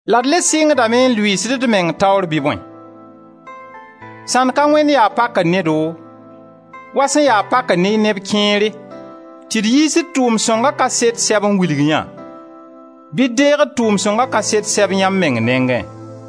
La d le sɩngdame n lʋɩɩsd d meng taoor bɩ bõe? Sãnd ka wẽnd yaa pakre ne-do, wa sẽn ya pakr ne neb kẽere, tɩ d yiis d tʋʋm-sõnga kaset sɛb n wilg yã, bɩ d deeg d tʋʋm-sõnga kaset sɛb yãmb meng nengẽ?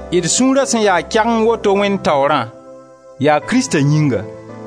D sũura sẽn ya kɛgeng woto Wẽnd taoorã, yaa Krista yĩnga.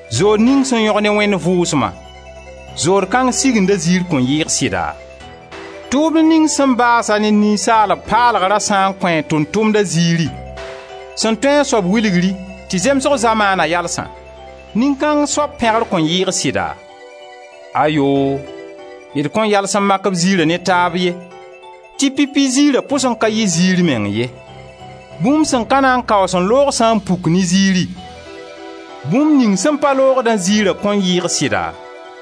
Zood ning sẽn yõg ne Wẽnd Vʋʋsma, zood kãng Siginda ziir kõn yɩɩg sɩda? Tʋʋmd ning sẽn baas-a ne ninsaalb paalgrã sã n kõ a tʋʋm-tʋmda ziiri, sẽn tũ a soab wilgri tɩ zemsg zamaana yalsã, nin-kãng soab pẽgr kõn yɩɩg sɩda? Ayoo! D kõn yals n mak b ziira ne taab ye tɩ pipi ziira pʋs n ka yɩ zɩɩr meng ye. Bũmb sẽn ka na n kaoos n loog sã n puk ne ziiri, bũmb ning sẽn pa loogdã ziira kõn yɩɩg sɩda?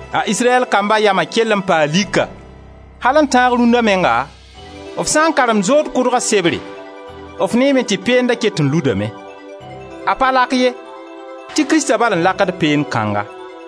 A Israyɛl kamba yama kell n paa lika. Al n tãag rũnda menga, f sã n karemd zood kʋdga sebre, f neeme tɩ peenda ket n ludame. A pa lak ye, tɩ Krista bal n lakd peend kãnga.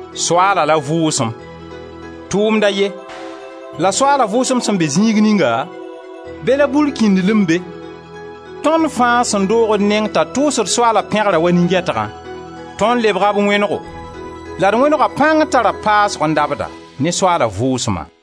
Soaala la Vʋʋsem: tʋʋmd a ye; la Soaala Vʋʋsem sẽn be zĩig ninga, be la burkĩndlem be. Tõnd fãa sẽn doog d neng t'a tʋʋsd Soaala pẽgrã wa nin-gɛtgã, tõnd lebga b wẽnego la d wẽnega pãng tara paasgo n dabda, ne Soaala Vʋʋsma.